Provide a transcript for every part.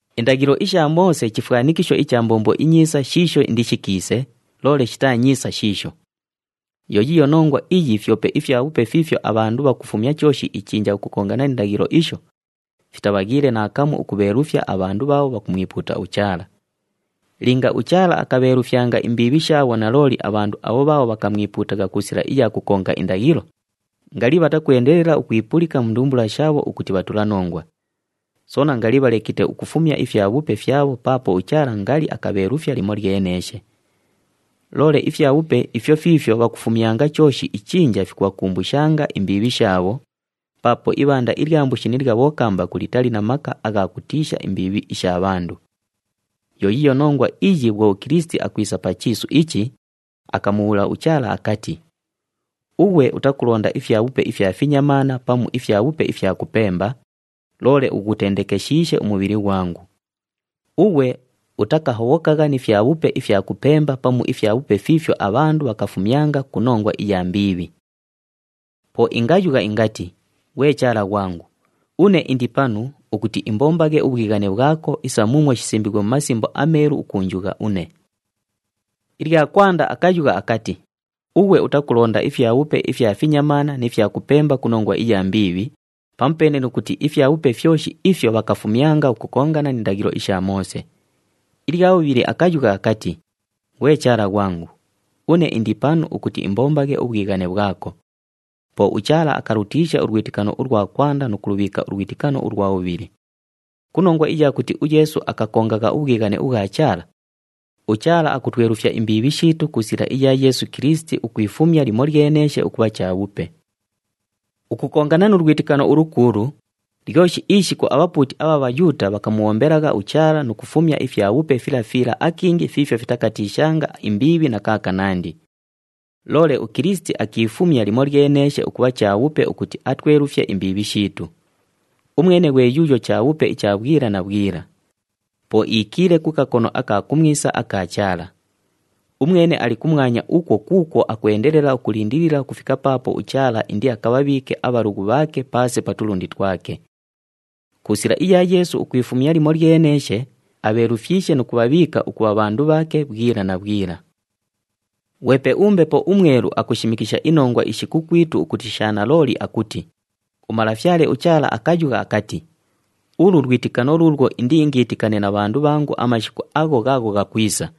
Indaghilo isha Moose chifwanikisho icha mbombo inyiisa shiisho indishikiise, loole shitaa nyiisa shiisho. Yo yiiyo nongwa iyi fyope ifyabhupe fiifyo abhandu bhakufumya chooshi ichinja ukukongana ni ndaghilo isho, fitabhaghiile naakamu ukubheelufya abhandu bhaabho bhakumwipuuta uChaala. Linga uChaala akabheelufyanga imbiibhi shaabho nalooli abhandu abho bhaabho bhakamwipuutagha ku sila iya kukonga indaghilo, ngali bhatakwendelela ukwipulika mu ndumbula shaabho ukuti bhatulanongwa. Soona ngali bhalekite ukufumya ifyabhupe fyabho paapo uChaala ngali akabheelufya limolyeneeshe. Loole ifyabhupe ifyo fiifyo bhakufumyanga chooshi ichinja fikubhakumbushanga imbiibhi shaabho, paapo ibhanda ilya mbushi ni lya bhokambaku litali na maka agha kutiisha imbiibhi isha bhandu. Yo yiiyo nongwa iyi bhwo uKilisiti akwisa pa chiisu ichi, akamubhuula uChaala akati, “Ughwe utakulonda ifyabhupe ifya finyamaana pamu ifyabhupe ifya kupemba, loole ughutendekeshiishe umubhili ghwangu. Ughwe utakahobhokagha ni fyabhupe ifya kupemba pamu ifyabhupe fiifyo abhandu bhakafumyanga ku nongwa iya mbiibhi. Po ingayugha ingati, ‘Ghwe Chaala ghwangu! Une indi panu, ukuti imbombaghe ubhwighane bhwako, isa muumwo shisimbiighwe mu Masimbo aMeelu ukuunjugha une.’” Ilya kwanda akayugha akati, “Ughwe utakulonda ifyabhupe ifya finyamaana ni fya kupemba ku nongwa iya mbiibhi,” pamupeene nu kuti ifyabhupe fyoshi ifyo bhakafumyanga ukukongana ni ndaghilo isha Moose. Ilya bhubhili akayugha akati, “Ghwe Chaala ghwangu! Une indi panu ukuti imbombaghe ubhwighane bhwako.” Po uChaala akalutiisha ulwitikano ulwa kwanda nu kulubhiika ulwitikano ulwa bhubhili. Ku nongwa iya kuti uYeesu akakongagha ubhwighane ubhwa Chaala, uChaala akutwelufya imbiibhi shiitu ku sila iya Yeesu Kilisiti ukwifumya limolyeneeshe ukubha chabhupe. Ukukongana nu lwitikano ulukuulu, lyoshi ishiku abhapuuti abha Bhayuuta bhakamubhombelagha uChaala nu kufumya ifyabhupe fila fila akingi fiifyo fitakatiishanga imbiibhi na kaakanandi. Loole uKilisiti akiifumya limolyeneeshe ukubha chabhupe ukuti atwelufye imbiibhi shiitu. Umwene ghwe yuuyo chabhupe icha bhwila na bhwila. Po iikiile ku kakono aka kumwisa aka Chaala. Umwene ali kumwanya ukwo kuukwo akwendelela ukulindilila ukufika paapo uChaala indiakabhabhiike abhalughu bhaake paase pa tulundi twake. Ku sila iya Yeesu ukwifumya limolyeneeshe, abheelufyishe nu kubhabhiika ukubha bhandu bhaake bhwila na bhwila. Ghwepe uMbepo uMwelu akushimikisha inongwa ishi kukwitu ukuti sha nalooli akuti, “UMalafyale uChaala akayugha akati, ulu lwitikano luulwo indiingiitikane na bhandu bhangu amashiku agho ghaagho ghakwisa.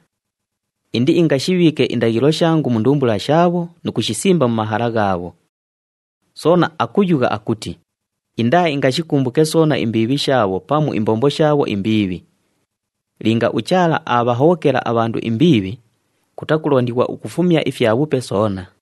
Indiingashibhiike indaghilo shangu mu ndumbula shaabho nu kushisimba mu mahala ghaabho.” Soona akuyugha akuti, “Indaaingashikumbuke soona imbiibhi shaabho pamu imbombo shaabho imbiibhi.” Linga uChaala aabhahobhokela abhandu imbiibhi, kutakulondighwa ukufumya ifyabhupe soona.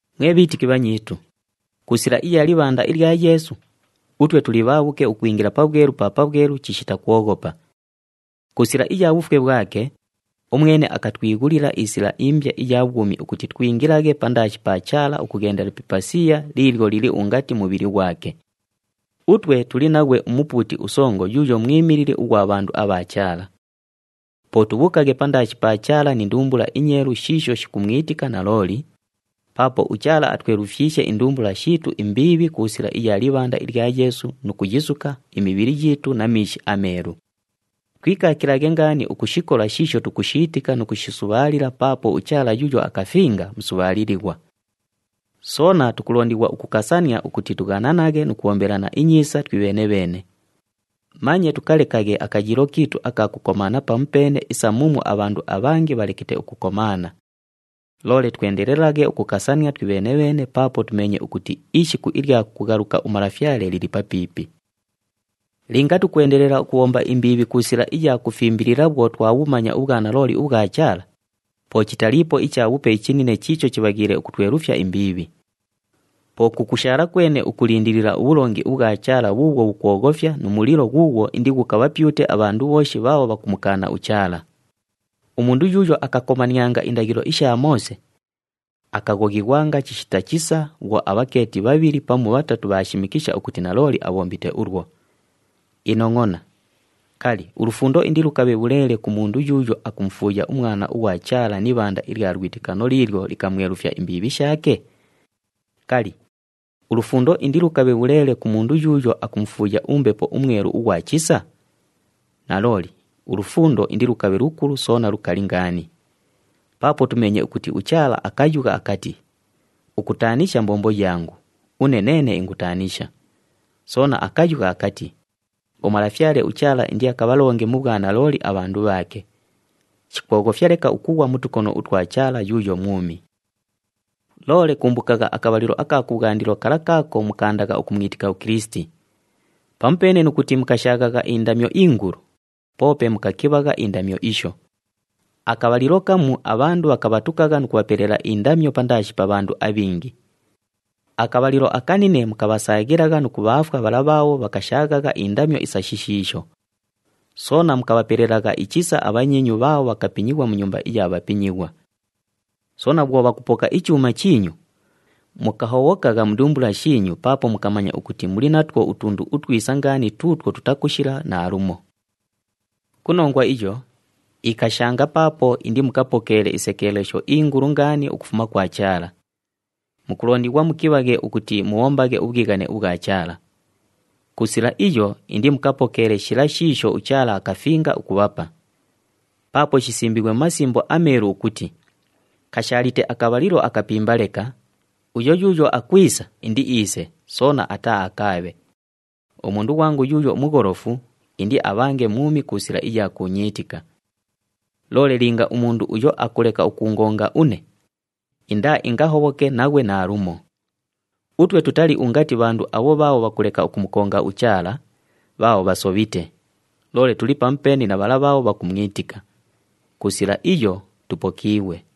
Mwe bhiitiki bhanyiitu, ku sila iya libhanda ilya Yeesu, utwe tuli bhaabhuke ukwingila Pabhwelu pa Pabhwelu chishita kwoghopa. Ku sila iya bhufwe bhwake, umwene akatwighulila isila imbya iya bhwumi ukuti twingilaghe pandaashi pa Chaala ukughendela pi ipasiya liilyo lili ungati mubhili ghwake. Utwe tuli naghwe uMupuuti uSongo yuuyo mwimilili ughwa bhandu abha Chaala. Po tubhuukaghe pandaashi pa Chaala ni ndumbula inyeelu shiisho shikumwitika nalooli, paapo uChaala atwelufyishe indumbula shiitu imbiibhi ku sila iya libhanda ilya Yeesu nu kuyisuka imibhili yiitu na miishi ameelu. Twikaakilaghe ngaani ukushikola shiisho tukushiitika nu kushisubhaalila paapo uChaala yuuyo akafinga, musubhaalilighwa. Soona tukulondighwa ukukasania ukuti tughananaghe nu kubhombelana inyiisa twibheene-bheene. Manye tukalekaghe akayiilo kiitu aka kukomaana pamupeene isa muumwo abhandu abhangi bhalekite ukukomaana. Loole twendelelaghe ukukasania twibheene-bheene paapo tumeenye ukuti ishiku ilya kughaluka uMalafyale lili papiipi. Linga tukwendelela ukubhomba imbiibhi ku sila iya kufimbilila bhwo twabhumanya ubhwanalooli ubhwa Chaala, po chitaliipo ichabhupe ichinine chiicho chibhaghiile ukutwelufya imbiibhi. Po kukushaala kwene ukulindilila ubhulongi ubhwa Chaala bhuubhwo bhukwoghofya nu mulilo ghuughwo indighukabhapyute abhandu bhooshi bhaabho bhakumukaana uChaala. Umundu yuuyo akakomanianga indaghilo isha Moose, akaghoghighwanga chishita chisa bhwo abhakeeti bhabhili pamu bhatatu bhaashimikisha ukuti nalooli abhombite ulwo. Inongʼona! Kali, ulufundo indilukabhe bhuleele ku mundu yuuyo akumufuuya uMwana ughwa Chaala ni ibhanda ilya lwitikano liilyo likamwelufya imbiibhi shaake? Kali, ulufundo indilukabhe bhuleele ku mundu yuuyo akumufuuya uMbepo uMwelu ughwa chisa? Nalooli, ulufundo indilukabhe lukulu soona lukali ngaani. Paapo tumeenye ukuti uChaala akayugha akati, “Ukutaanisha mbombo yangu, une neene ingutaanisha.” Soona akayugha akati, “UMalafyale uChaala indiakabhalonge mu bhwanalooli abhandu bhaake.” Shikwoghofya leka ukughwa mu tukono utwa Chaala yuuyo mwumi. Loole kumbukagha akabhalilo aka kubhwandilo kala kaako mukaandagha ukumwitika uKilisiti. Pamupeene nu kuti mukashaaghagha indamyo ingulu, poope mukakibhagha indamyo isho. Akabhalilo kamu abhandu bhakabhatukagha nu kubhapelela indamyo pandaashi pa bhandu abhingi. Akabhalilo akanine mukabhasaaghilagha nu kubhaafwa bhala bhaabho bhakashaaghagha indamyo isa shishiisho. Soona mukabhapelelagha ichisa abhanyiinyu bhaabho bhakapinyighwa mu nyumba iya bhapinyighwa. Soona bhwo bhakubhapoka ichuuma chiinyu, mukahobhokagha mu ndumbula shiinyu paapo mukamanya ukuti muli natwo utundu utwisa ngaani tuutwo tutakushila naalumo. Ku nongwa iyo, ikashanga paapo indimukapokeele isekeelesho ingulu ngaani ukufuma kwa Chaala. Mukulondighwa mukibhaghe ukuti mubhombaghe ubhwighane ubhwa Chaala. Ku sila iyo, indimukapokeele shila shiisho uChaala akafinga ukubhapa. Paapo shisimbiighwe mu Masimbo aMeelu ukuti, “Kashaalite akabhalilo akapimba leka, uyo yuuyo akwisa, indiiise, soona ataaakaabhe. Umundu ghwangu yuuyo mugholofu, indiabhange mwumi ku sila iya kuunyiitika. Loole linga umundu uyo akuleka ukuungonga une, indaaingahobhoke naghwe naalumo.” Utwe tutali ungati bhandu abho bhaabho bhakuleka ukumukonga uChaala, bhaabho bhasobhite. Loole tuli pamupeene na bhala bhaabho bhakumwitika. Ku sila iyo, tupokiighwe.